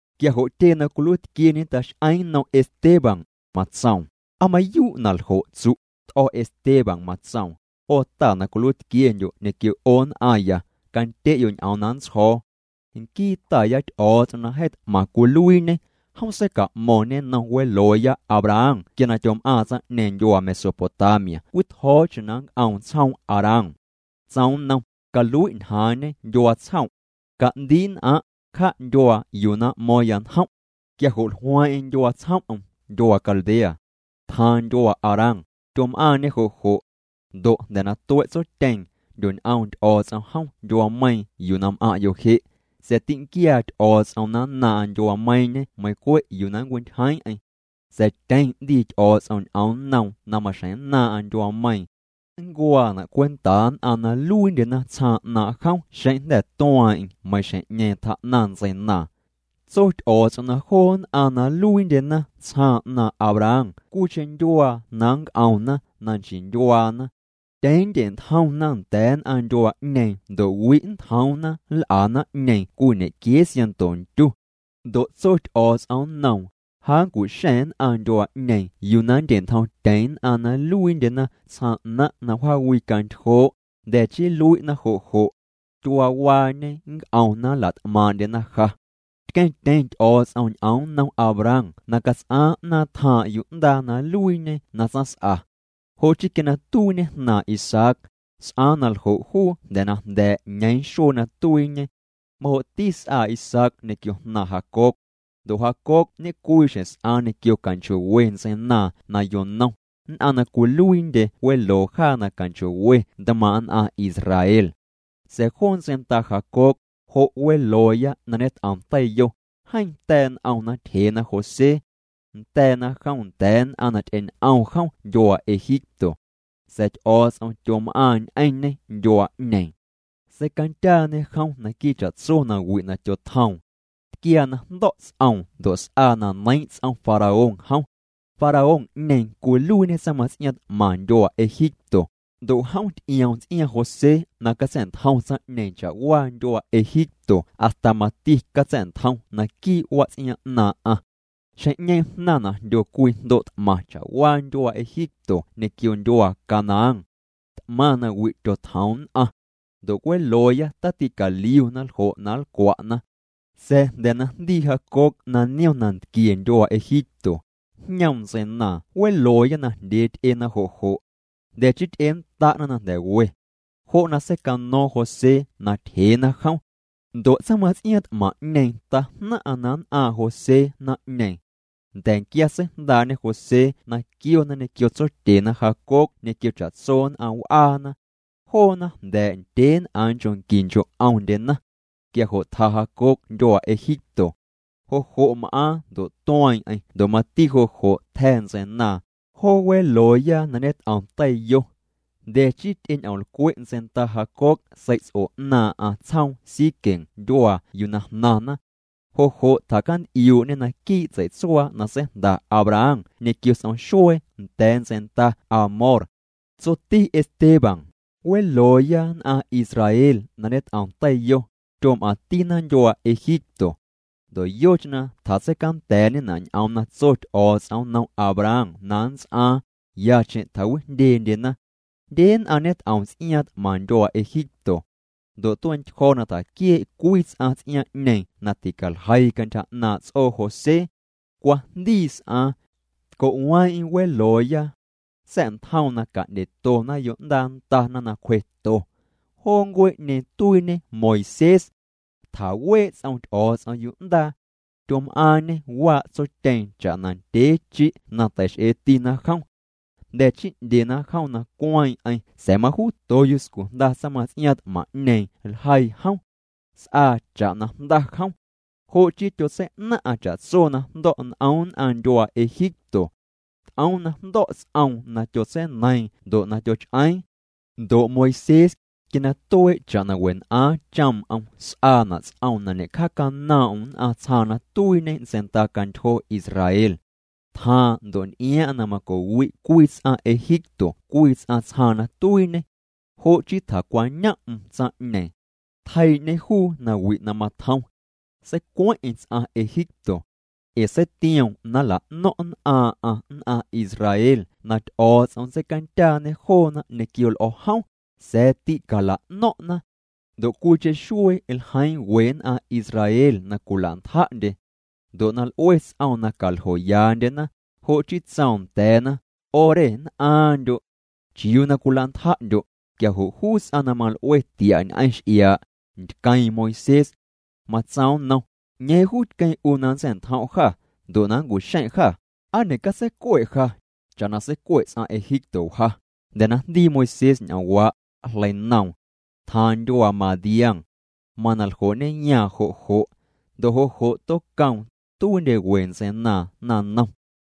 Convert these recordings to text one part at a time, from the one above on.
Quia jo' tyee na cwiluiitquieñe tax'eeⁿ nnom Esteban, matsoom: —¿Aa mayuu' na ljo' tsu'? T'o̱ Esteban matsoom: —'O ta na cwiluiitquiendyo' ñequio 'o nn'aⁿya, candye'yo' ñ'oom na nntsjo̱o̱. Nquii Taya Ty'o̱o̱ts'om na jeeⁿ t'maⁿ cwiluiiñê, jom seica'mo̱ⁿñê nnom welooya Abraham quia na tyom'aaⁿ tsaⁿ'ñeeⁿ ndyuaa Mesopotamia cwii tjo̱o̱cheⁿ na nnc'oom tsjoom Harán. Tsoom nnom: “Calui' ñjaaⁿñe ndyuaa tsjom'. Ca'ndii' nn'aⁿ', cja' ndyuaa yuu na m'mo̱o̱ⁿya njom'.” Quia jo' jlueeⁿ'eⁿ ndyuaa tsjom'm, ndyuaa Caldea. Tjaaⁿ ndyuaa Harán, tyom'aaⁿñê jo' jo'. Ndo' jnda̱ na tue' tsotyeeⁿ, jndyoñ'oom Ty'o̱o̱ts'om jom ndyuaameiiⁿ yuu na m'aⁿ'yo' je'. Sa̱a̱ tînquiaa Ty'o̱o̱ts'om na nnaaⁿ'aⁿ ndyuaameiiⁿñe meiⁿ cwe' yuu na nncwintyjeeⁿ'eⁿ. Sa̱a̱ tyeⁿ 'ndii Ty'o̱o̱ts'om ñ'oom nnoom na maxjeⁿ nnaaⁿ'aⁿ ndyuaameiiⁿ. Nncuaana' cwentaa nn'aⁿ na nluiindyena tsjaaⁿ 'naaⁿ' jom xeⁿ jnda̱ tueeⁿ'eⁿ meiiⁿ xjeⁿ'ñeeⁿ tjaa'naⁿ ntseinaaⁿ. Tso Ty'o̱o̱ts'om na joo nn'aⁿ na nluiindyena tsjaaⁿ 'naaⁿ' Abraham cwiicheⁿ ndyuaa na nnc'omna na nchii ndyuaana. Tyeⁿ nndye'ntjomna nda̱a̱ nn'aⁿ ndyuaa'ñeeⁿ ndo' wi' nntjoomna nl'a naⁿ'ñeeⁿ cwii ñequiee siaⁿnto ntyu. Ndo' tso Ty'o̱o̱ts'om nnoom: “Ja nncu'xa̱ⁿ nn'aⁿ ndyuaa'ñeeⁿ yuu na nndye'ntjomtyeⁿ nn'aⁿ na nluiindyena tsjaaⁿ 'naⁿ' na wjaawicantyjoo', jnda̱ chii nlui'na jo' jo'. Tyuaawaañe nnc'omna nlat'maaⁿ'ndyena ja.” Tqueⁿtyeⁿ Ty'o̱o̱ts'om ñ'oom nnom Abraham na cats'aaⁿ 'naaⁿ tjaaⁿ' yu'ndaa na nluiiñe na tsaⁿs'a. Jo' chii quia na tuiiñe jnaaⁿ Isaac, s'aaⁿ na ljo' juu jnda̱ na jnda̱a̱' ñeeⁿ xuee na tuiiñe. Majo'ti s'aa Isaac ñequio jnaaⁿ Jacob. Ndo' Jacob ñecwii xjeⁿ s'aaⁿ ñequio canchoo'we ntseinaaⁿ na yonom, nn'aⁿ na cwiluiindye weloo jaa na canchoo'we ntmaaⁿ' nn'aⁿ Israel. ’Sa̱a̱ joo ntseinda Jacob, jo' welooya na ñet'om teiyo, jeeⁿ ta̱a̱' n'omna tyjeena José. Nda̱a̱na jom nda̱a̱ nn'aⁿ na ty'eñ'om jom ndyuaa Egipto. Sa̱a̱ Ty'o̱o̱ts'om tyom'aaⁿ ñ'eⁿñê ndyuaa'ñeeⁿ. Seicandyaañe jom naquii' cha'tso nawi' na tyotjoom. Tquiaa na jndo̱' ts'oom ndo' s'aa na neiiⁿ' ts'om Faraón jom. Faraón'ñeeⁿ cwiluiiñê tsaⁿmaⁿts'iaaⁿ t'maⁿ ndyuaa Egipto, ndo' jom ty'ioom ts'iaaⁿ José na catsa̱'ntjom tsaⁿ'ñeeⁿ cha'waa ndyuaa Egipto hasta mati catsa̱'ntjom naquii' wats'iaaⁿ 'naaⁿ'aⁿ. ’Xjeⁿ'ñeeⁿ jnaⁿna' na jndyo cwii jndo' t'maⁿ cha'waa ndyuaa Egipto ñequio ndyuaa Canaán. T'maⁿ nawi' tyotjoom nn'aⁿ. Ndo' welooya taticaliuna ljo' na nlcwa'na. Sa̱a̱ jnda̱ na jndii Jacob na niom nantquie ndyuaa Egipto, jñoom ntseinaaⁿ welooya najndyee ty'ena jo' jo'. Jnda̱ chii ty'ennda'na na jnda̱ we. Jo' na secaño̱o̱ⁿ José na tyjeena jom. Ndo' tsaⁿmaⁿts'iaaⁿ t'maⁿ'ñeeⁿ tajnaⁿ'aⁿ na nn'aaⁿ' José naⁿ'ñeeⁿ. Nda̱nquia seijndaa'ñe José na quiona ñequio tsotyena Jacob ñequio cha'tso nn'aⁿ w'aana. Joona jnda̱a̱' ndyeen'aaⁿ nchoo' qui nchoo' 'omndyena. Quia jo' tja Jacob ndyuaa Egipto. Jo' jo' m'aaⁿ ndo' tueeⁿ'eⁿ ndo' mati jo' jo' tja̱ ntseinaaⁿ, joo welooya na ñet'om teiyo. Jnda̱ chii ty'eñ'omlcwe' ntseinda Jacob sei'ts'o 'naaⁿ'aⁿ tsjoom Siquem ndyuaa yuu na jnaⁿna. Jo' jo' tjacant'iuu'ñê naquii' tsei'tsuaa na seijnda Abraham ñequio s'om xuee nda̱a̱ ntseinda Hamor. Tsoti Esteban: —Welooya nn'aⁿ Israel na ñet'om teiyo, tyom'aⁿtina ndyuaa Egipto. Ndo' yocheⁿ na tjatseicanda̱a̱'ñena' ñ'oom na tso Ty'o̱o̱ts'om nnom Abraham na nnts'aaⁿ, yacheⁿ tjawijndyendyena. Jndye nn'aⁿ ñet'om ts'iaaⁿ t'maⁿ ndyuaa Egipto. Ndo' tuee'ntyjo̱ na tjaquiee' cwii ts'aⁿ ts'iaaⁿ'ñeeⁿ na ticaljeii cantyja 'naaⁿ' ts'oo José. Cwajndii s'aaⁿ. Tco'weeⁿ'eⁿ welooya. Sa̱'ntjoom na ca'ndyetona yo'ndaa ndana na cwjeto. Joo ncuee'ñeeⁿ tuiiñe Moisés. Tjawee' ts'om Ty'o̱o̱ts'om yu'ndaa. Tyom'aaⁿñê waa' tsotyeeⁿ cha'na ndyee chi' na teix'eetina jom. Jnda̱ chii 'ndyena jom na cueeⁿ'eⁿ sa̱a̱ majuuto yuscu jnda tsaⁿmaⁿts'iaaⁿ t'maⁿ'ñeeⁿ ljeii jom. S'aa cha'na jnda jom. Jo' chii tyotsei'naⁿ'aⁿ cha'tso na jndo̱' n'om nn'aⁿ ndyuaa Egipto. T'oom na jndo̱' ts'oom na tyotseineiiⁿ ndo' na tyoch'eeⁿ. ’Ndo' Moisés, quia na tuee' cha'na wen'aaⁿ choom'm s'aana' ts'oom na ñe'cjaacanoom'm nn'aⁿ tsjaaⁿ na tuiiñê ntseindacantyjo Israel. Tjaaⁿ ndo' nty'iaaⁿ'aⁿ na maco'wi' cwii ts'aⁿ Egipto cwii ts'aⁿ tsjaaⁿ na tuiiñê. Jo' chii tjacwañom'm tsaⁿ'ñeeⁿ. Tjeii'ñê juu nawi' na matjom. Seicueⁿ'eⁿ ts'aⁿ Egipto. Ee seitioom na nla'no̱ⁿ' nn'aaⁿ'aⁿ nn'aⁿ Israel na Ty'o̱o̱ts'om nntseicandyaañe joona ñequio l'o̱ jom, sa̱a̱ tîcala'no̱ⁿ'na. Ndo' cwiicheⁿ xuee ljeiiⁿ we nn'aⁿ Israel na cwilantja'ndye. Ndo' na l'ue ts'oom na caljoyaandyena, jo' chii tsoom nda̱a̱na: “'O re mann'aaⁿndyo'. ¿Chiuu na cwilantja'ndyo'?” Quia jo' juu ts'aⁿ na mal'ue tia' ñ'eⁿ x'iaa', ntqueeⁿ Moisés. Matsoom nnom: “¿'Ñeeⁿ juu tqueⁿ 'u na nntsa̱'ntjom' jâ, ndo' na nncu'xeⁿ' jâ? ¿Aa ñe'catseicue' ja, cha'na seicue' ts'aⁿ Egipto wja?” Jnda̱ na jndii Moisés ñ'oomwaa', jleinoom. Tjaaⁿ ndyuaa Madián. Mana ljoo'ñeyaaⁿ jo' jo'. Ndo' jo' jo' tocoom, tuiindye we ntseinaaⁿ naⁿnom.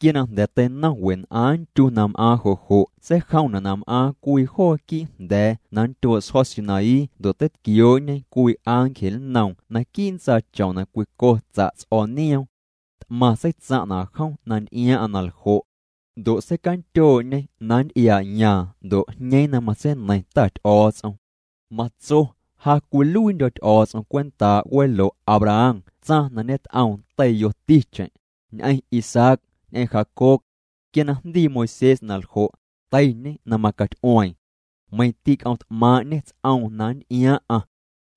’Quia na jnda̱ teinom wen'aaⁿ ntyu na m'aaⁿ jo' jo' seijomna' na m'aaⁿ cwii joo quii' jnda̱a̱ na nndyoo' sjo̱ Sinaí ndo' teitquioo'ñe cwii ángel nnoom naquii' ntsaachom na cwico tsa' ts'o̱o̱ n'ioom. T'maⁿ seitsaⁿ'na' jom na nty'iaaⁿ'aⁿ na ljo'. Ndo' seicandyoo'ñê na nnty'iaa'yaaⁿ ndo' jñeeⁿ na matseineiⁿ Ta Ty'o̱o̱ts'om. Matso: “Ja cwiluiindyo̱ Ty'o̱o̱ts'om cwentaa' welo' Abraham tsaⁿ na ñet'oom teiyoticheⁿ, ñ'eⁿ Isaac, ñ'eⁿ Jacob.” Quia na jndii Moisés na ljo', teiñê na macaty'ueeⁿ. Meiⁿ tîc'oomt'maaⁿ'ñê ts'oom na nnty'iaaⁿ'aⁿ.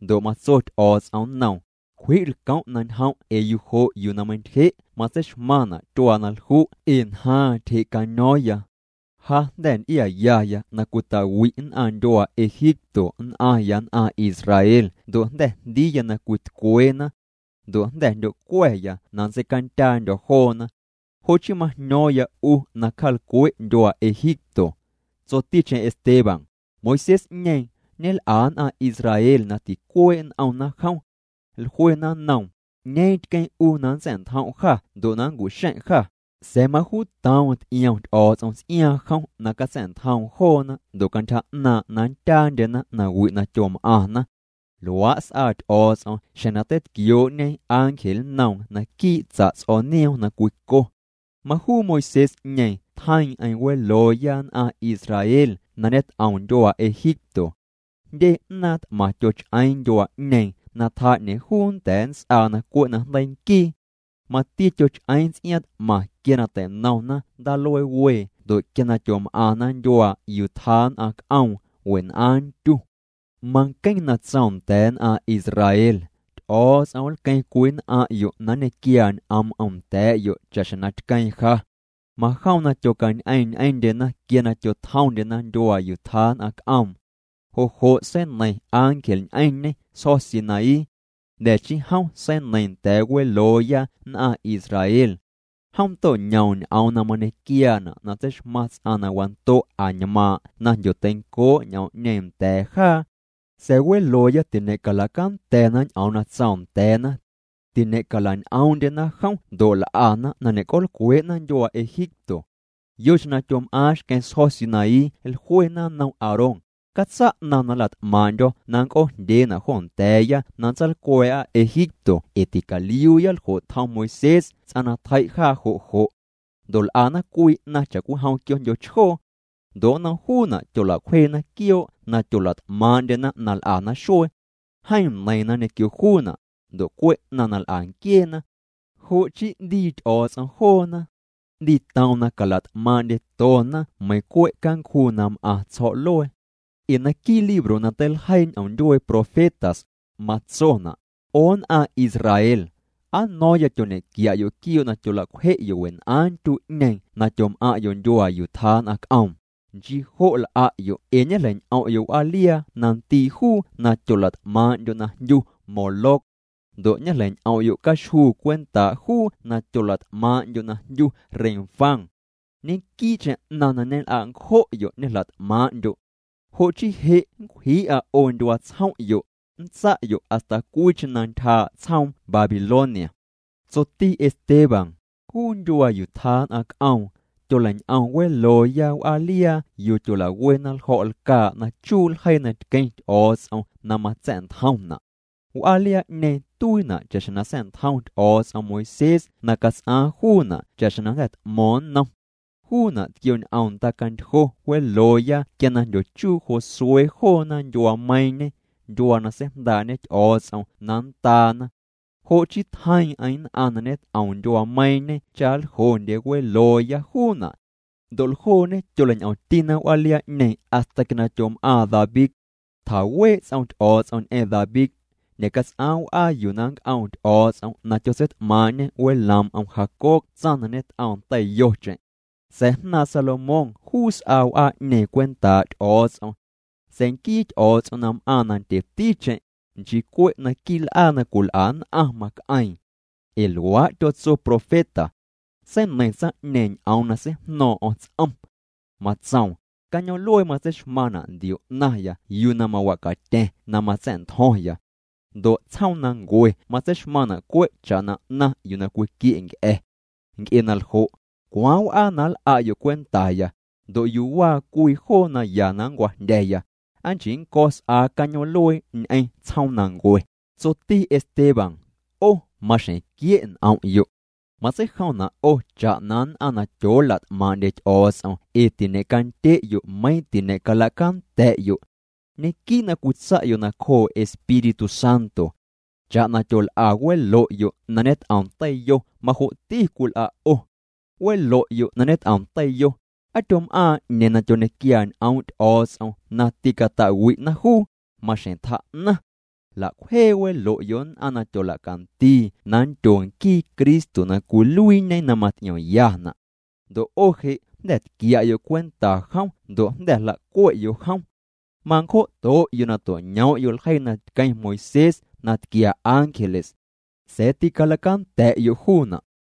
Ndo' matso Ty'o̱o̱ts'om nnoom: “Cwji' lcom' na ñjom' ee yujo' yuu na meintyje' matseixmaⁿna' tyuaa na lju' ee ñjaaⁿ tyje'caño̱o̱ⁿya. Ja jnda̱ nty'iayaya na cwita'wi' nn'aⁿ ndyuaa Egipto nn'aⁿya nn'aⁿ Israel ndo' jnda̱ jndiiya na cwitcweena. Ndo' jnda̱ jndyocua̱ya na nntseicandyaandyo̱ joona. Jo' chii majño̱o̱ⁿya 'u na cja'lcwe' ndyuaa Egipto.” Tsoticheⁿ Esteban: —Moisés'ñeeⁿ, ñel'a nn'aⁿ Israel na ticuee' n'omna jom. Jluena nnoom: “¿'Ñeeⁿ tqueⁿ 'u na nntsa̱'ntjom' jâ ndo' na nncu'xeⁿ' jâ?” Sa̱a̱ majuutoom ty'iom Ty'o̱o̱ts'om ts'iaaⁿ jom na catsa̱'ntjoom joona ndo' cantyja 'naaⁿ' na nndyaandyena nawi' na tyom'aⁿna. Luaa' s'aa Ty'o̱o̱ts'om xjeⁿ na teitquioo'ñe ángel nnoom naquii' tsa' ts'o̱o̱ nioom na cwico. Majuu Moisés'ñeeⁿ tjeiiⁿ'eⁿ welooya nn'aⁿ Israel na ñet'om ndyuaa Egipto. Jndye 'naaⁿ t'maⁿ tyoch'eeⁿ ndyuaa'ñeeⁿ na tjaa 'ñeeⁿ juu nnda̱a̱ nnts'aa na cwe' na jndeii nquii. Mati tyoch'eeⁿ ts'iaaⁿ t'maⁿ quia na tei'nomna Ndaaluee Wee ndo' quia na tyom'aⁿna ndyuaa yuu tjaa nn'aⁿ c'oom wen'aaⁿ ntyu. Manqueⁿ na tsoom nda̱a̱ nn'aⁿ Israel: “Ty'o̱o̱ts'om nlqueeⁿ cwii nn'aⁿ'yo' na nñequiaa ñ'oom'm nda̱a̱'yo' cha'xjeⁿ na tqueeⁿ ja.” Majom na tyocañ'eeⁿ ñ'eⁿndyena quia na tyotjomndyena ndyuaa yuu tjaa nn'aⁿ c'oom. Jo' jo' seineiⁿ ángel ñ'eⁿñê sjo̱ Sinaí. Jnda̱ chii jom seineiiⁿ nda̱a̱ welooya nn'aⁿ Israel. Jom to'ñoom ñ'oom na mañequiaana' na tseixmaⁿ ts'aⁿ na wando' añmaaⁿ' na jndyoteincoo' ñ'oom'ñeeⁿ nda̱a̱ jaa. ’Sa̱a̱ welooya tiñe'calacanda̱na ñ'oom na tsoom nda̱a̱na. Tiñe'calañ'oom'ndyena jom ndo' l'ana na ñe'c'oolcwee'na ndyuaa Egipto. Yocheⁿ na tyom'aaⁿ xqueⁿ sjo̱ Sinaí jluena nnom Aarón: “Catsa' 'naⁿ na nlat'maaⁿ'ndyo̱ na nnc'oojndyeena' jo nda̱a̱ya na nntsaalcwa̱a̱'a Egipto ee ticaliuuya ljo' tjom Moisés ts'aⁿ na tjei' jaa jo' jo'.” Ndo' l'ana cwii 'naⁿ cha'cwijom quioo'jndyo chjoo. Ndo' nnom juuna' tyola'cwjeena quioo' na tyola't'maaⁿ'ndyena na l'ana xuee. Jeeⁿ neiiⁿna ñequio juuna', ndo' cwe' 'naⁿ na l'a nquieena. Jo' chii 'ndii Ty'o̱o̱ts'om joona. 'Ndiitoom na calat'maaⁿ'ndyetona meiiⁿ cwe' cancjuu na m'aⁿ tsjo̱'luee. Ee naquii' libro na teiljeii ñ'oom ndyuee profetas, matsona': 'O nn'aⁿ Israel, ¿aa no̱o̱ⁿya tyoñequia'yo' quioo' na tyolacwje'yo' wen'aaⁿ ntyu'ñeeⁿ na tyom'aⁿ'yo' ndyuaa yuu tjaa nn'aⁿ c'oom? Nchii jo' l'a'yo' ee ñejleiñ'om'yo' w'aaliaa na ndii' juu na tyolat'maaⁿ'ndyo' na jndyu Moloc. Ndo' ñejleiñ'om'yo' caxjuu cwentaa' juu na tyolat'maaⁿ'ndyo' na jndyu Renfán. Ñequii'cheⁿ 'naⁿ na ñel'a' ncjo'yo' ñejlat'maaⁿ'ndyo'. Jo' chii je' nncwjii'a 'o ndyuaa tsjom'yo', nntsa'yo' hasta cwiicheⁿ na ntyjaa' tsjoom Babilonia. Tsoti Esteban: —Juu ndyuaa yuu tjaa nn'aⁿ c'oom, tyoleiñ'om welooya w'aaliaa yuu tyolawena ljo̱' lcaa' na chuu' ljeii na tqueⁿ Ty'o̱o̱ts'om na matsa̱'ntjomna'. W'aaliaa'ñeeⁿ tuiina' cha'xjeⁿ na sa̱'ntjom Ty'o̱o̱ts'om Moisés na cats'aaⁿ juuna' cha'xjeⁿ na jnda̱ t'mo̱o̱ⁿ nnom. Juuna' tquioñ'om ndacantyjo welooya quia na jndyochuu Josué joona ndyuaameiiⁿñe, ndyuaa na seijndaa'ñe Ty'o̱o̱ts'om na nndaana. Jo' chii tjeiiⁿ'eⁿ nn'aⁿ na ñet'om ndyuaameiiⁿñe cha ljoo'ndye welooya juuna'. Ndo' ljooñe tyoleiñ'omtina w'aaliaa'ñeeⁿ hasta quia na tyom'aaⁿ David. Tjawee' ts'om Ty'o̱o̱ts'om ñ'eⁿ David. Ñe'cats'aaⁿ w'aa yuu na nnc'oom Ty'o̱o̱ts'om na tyotseit'maaⁿ'ñe weloom'm Jacob tsaⁿ na ñet'oom teiyocheⁿ. Sa̱a̱ jnaaⁿ Salomón juu s'aa w'aa'ñeeⁿ cwentaa' Ty'o̱o̱ts'om. Sa̱a̱ nquii Ty'o̱o̱ts'om na m'aaⁿ na ndyeticheⁿ, nchii cwe' naquii' l'aa na cwil'a nn'aⁿ mac'eeⁿ. Ee luaa' tyotso profeta. Seineiⁿ tsaⁿ'ñeeⁿ ñ'oom na seijno̱o̱ⁿ'o̱ⁿ ts'om. Matsoom: Cañoom'luee matseixmaⁿna' ndio 'naⁿya yuu na mawacatya̱ⁿ na matsa̱'ntjo̱ⁿya. Ndo' tsjoomnancue matseixmaⁿna' cwe' cha'na 'naⁿ yuu na cwiquie' nc'a̱. Nc'e na ljo', ¿cwaaⁿ w'aa na nl'a'yo' cwentaya? Ndo' ¿yuu waa cwii joo na ya na nncwajndya̱ya? ¿Aa nchii nnco̱ s'aa cañoom'luee ñ'eⁿ tsjoomnancue? Tsoti Esteban: —'O maxjeⁿ quie' n'om'yo'. Matseijomna' 'o cha'na nn'aⁿ na tyoolat'maaⁿ'ndye Ty'o̱o̱ts'om ee tiñe'candye'yo' meiⁿ tiñe'calacanda̱'yo'. Ñequii' na cwitsa'yo' nacjoo' Espíritu Santo. Cha'na tyol'a welo'yo' na ñet'om teiyo majo'ti cwil'a' 'o. Welo'yo' na ñet'om teiyo, ¿Aa tyom'aaⁿ 'ñeeⁿ na tyoñequiaa ñ'oom' Ty'o̱o̱ts'om na tîcata'wi'na juu? Maxjeⁿ tjaa'naⁿ. Jla'cwjee welo'yo' nn'aⁿ na tyola'candii na nndyo nquii Cristo na cwiluiiñe na maty'iomyana'. Ndo' 'o je' jnda̱ tquia'yo' cwenta jom ndo' jnda̱ jla'cue'yo' jom. Mancjo'to'yo' na to'ñoom'yo' ljeii na tqueⁿ Moisés na tquia ángeles. Sa̱a̱ tîcalacanda̱'yo' juuna'.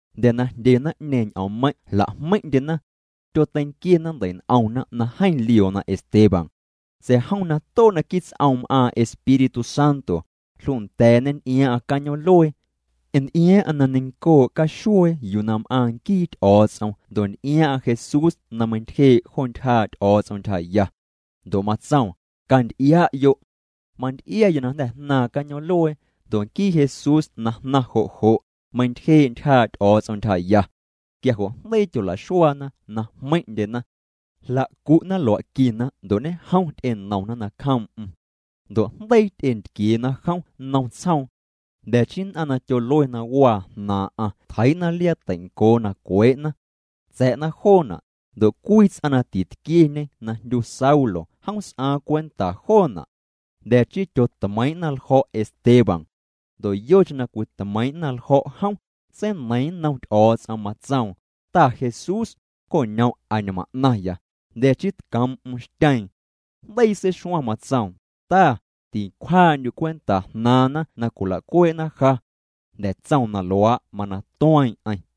Jnda̱ na jndye naⁿ'ñeeⁿ ñ'oommeiⁿ' jla'jmeiⁿ'ndyena. Tyoteinquiena ndei'n'omna na jeeⁿ lioona Esteban. Sa̱a̱ jom na too' naquii' ts'oom m'aaⁿ Espíritu Santo, jlunda̱a̱ñê nty'iaaⁿ'aⁿ cañoom'luee. Nty'iaaⁿ'aⁿ na neiⁿcoo' caxuee yuu na m'aaⁿ nquii Ty'o̱o̱ts'om ndo' nty'iaaⁿ'aⁿ Jesús na meintyjee' jo ntyjaa' Ty'o̱o̱ts'om ntyjaya. Ndo' matsoom: —Canty'ia'yo'. Manty'iaya na jnda̱ jnaaⁿ cañoom'luee, ndo' nquii Jesús na jnaⁿ jo' jo', meintyjee' ntyjaa' Ty'o̱o̱ts'om ntyjaya. Quia jo' jndeii tyolaxuaana na jmeiⁿ'ndyena. Jlacu'na lua'quina ndo' ñejom ty'enomna nacjoom'm. Ndo' jndeii ty'entquieena jom nnom tsjoom. Jnda̱ chii nn'aⁿ na tyolue na waa jnaaⁿ'aⁿ tjeii'na liaa na teincoo na cwee'na. Tsa̱'na joona', ndo' cwii ts'aⁿ na titquieñe na jndyu Saulo jom s'aaⁿ cwenta joona'. Jnda̱ chii tyotmeiiⁿ'na ljo̱' Esteban. Ndo' yocheⁿ na cwitmeiiⁿ'na ljo̱' jom, seineiiⁿ nnom Ty'o̱o̱ts'om, matsoom: —Ta Jesús, coñom' añmaⁿ 'naⁿya. Jnda̱ chii tcoom'm xtyeeⁿ. Jndeii seixuaⁿ, matsoom: —Ta, tincwjaa'ndyu' cwenta jnaaⁿna na cwila'cuee'na ja. Jnda̱ tsoom na luaa' mana tueeⁿ'eⁿ.